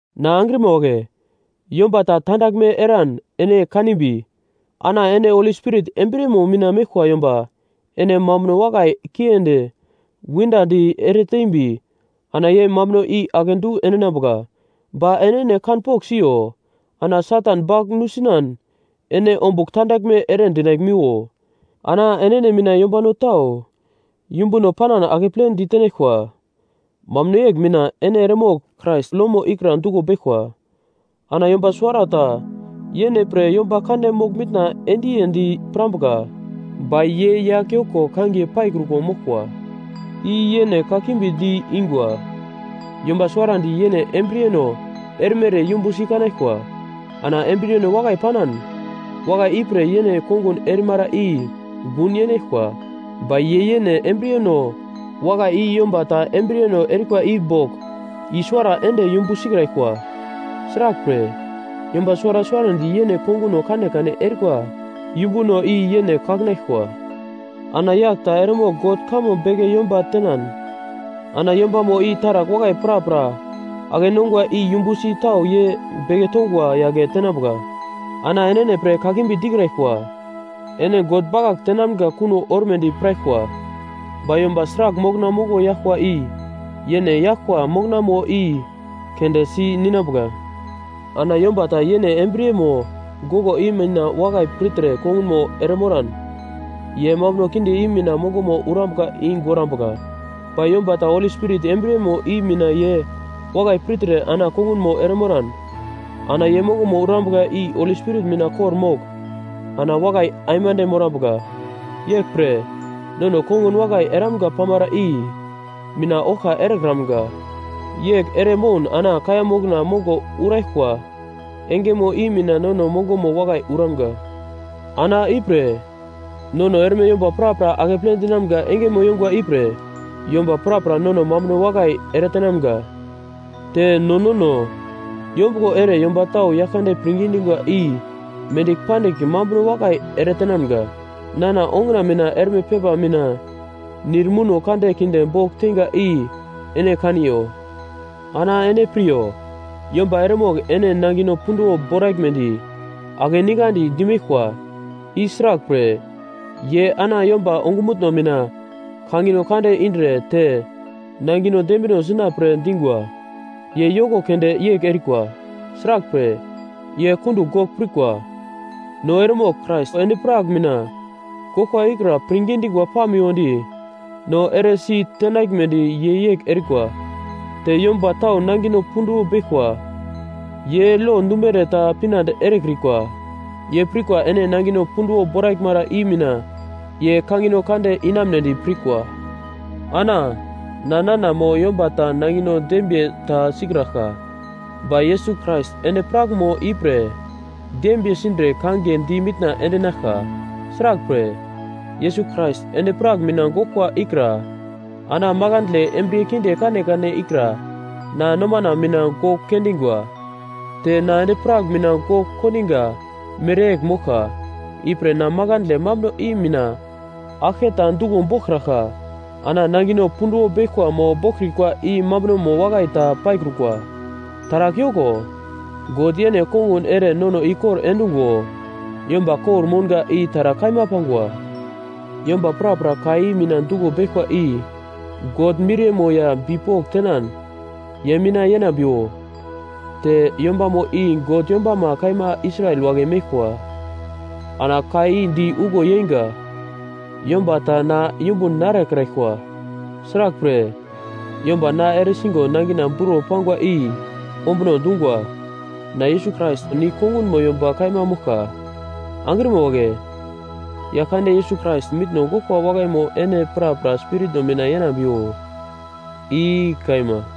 Na angrima wagle, yomba ta tandaglme eran ene kanimbi, ana ene Holi Spirit embriyemo mina meglkwa yomba ene mambuno wakai kiendi windadi eretembi ana ye mambuno i akedu endinambuka. Ba enene kanpogl siyo ana Satan bagl nusinan ene ombugl tandaglme ere dinaglmiwo. Ana enene mina yombano tau yumbuno panan akepledi tenaglkwa, mambuno yegl mina ene eremogl Krais lomo ikra duglo beglkwa. Ana yomba suwarata yene pre yomba kande mogl-mitna endiyendi pirambuka, ba ye yagl yoko kangiye paikruko moglkwa. I yene kakimbi di-ingwa. Yomba suwarandi yene embriyeno erimere yumbusi kanaglkwa. Ana embriyeno wakai panan, wakai ipre yene kongun erimara i gun yenaglkwa. Ba ye yene embriyeno wakai i yomba ta embriyeno erikwa i bogl i-suwara ende yumbu sikraglkwa. Sraglpre, yomba suwara suwarandi yene konguno kanekane erikwa yumbuno i yene kakinaglkwa. Ana yagl ta eremogl God kamo beke yomba tenan, ana yombamo i taragl wakai prapra ake-nongwa i yumbusi tau ye beke tongwa yagle tenambuka. Ana enene pre kakimbi dikraglkwa; ene God bakagl tenamga kuno ormedi piraglkwa. Ba yomba sragl mokna mongo yaglkwa i yene yaglkwa moknamo i keunde si ninambuka. Ana yomba ta yene embriyemo goglo i mina wakai pirtre kongunmo eremoran, ye mambuno kinde i mina mongomo urambuka i gorambuka. Ba yomba ta Holi Spirit embriyemo i mina ye wakai pirtre ana kongunmo eremoran, ana ye mongomo urambuka i Holi Spirit mina kor-mogl ana wakai aimande morambuka. Yeglpre, nono kongun wakai eramga pamara i mina oglka erekramga, yegl ere moun ana kaiya mokno mongo uraglkwa engemo i mina nono mongomo wakai uramga. Ana ipre, nono erme yomba prapra akeple dinamga engemo yongwa ipre yomba prapra nono mambuno wakai eretenamga, te no nono yombuglo ere yomba tau Yaglkande pirngi dingwa i mendigl pandigl mambuno wakai eretenamga. Nana onguna mina erme pepa mina nir muno kande kinde bogl teinga i ene kaniyo! Ana ene piryo, yomba eremogl ene nangino punduwo boraglmedi akeningandi dimeglkwa, i sraglpre, ye ana yomba ongumutno mina kangino kande indre te nangino dembino sina pre dingwa. Ye yoko keunde yegl erikwa; sraglpre, ye kundugl gogl pirkwa, no eremogl Krais endi-prak mina goglkwa ikra pirngi dingwa pamiwodi no eresi tenaglmedi ye yegl erikwa. Te yomba tau nangino punduwo beglkwa ye lo dumere ta pinande erekrikwa. Ye pirkwa ene nangino punduwo boraglmara i mina ye kangino kande inamunedi pirkwa. Ana na nana mo yomba ta nangino dembiye ta sikraglka, ba Yesus Krais endi-prakmo ipre dembiye sindre kangiye di mitna endinaglka. Sraglpre, Yesus Krais endi-prak mina goglkwa ikra ana makandle embriye kinde kanekane ikra na nomana mina gogl kendingwa, te na endi-prak mina gogl kondiga mereyegl moglka, ipre na makandle mambuno i mina aglke ta duglo boglkraglka. Ana nangino punduwo beglkwa mo boglkrikwa i mambunomo wakai ta paikrukwa, taragl yoko. God yene kongun ere nono ikor endungo yomba kor-mounga i taragl kaima pangwa. Yomba prapra ka i mina duglo beglkwa i God miriyemo ya bipok tenan ye mina yenambiwo, te yombamo i God yombama kaima Israel wagle meglkwa. Ana ka di uglo yeinga: Yomba ta na yumbun narekraglkwa. Sraglpre, yomba na eresigo nangina buro pangwa i ombuno dungwa, na Yesus Krais nigl kongunmo yomba kaima moglka. Angrima wagle, Yaglkande, Yesus Krais mitno goglkwa wakaimo ene prapra spiritno mina yenambiwo. I kaima.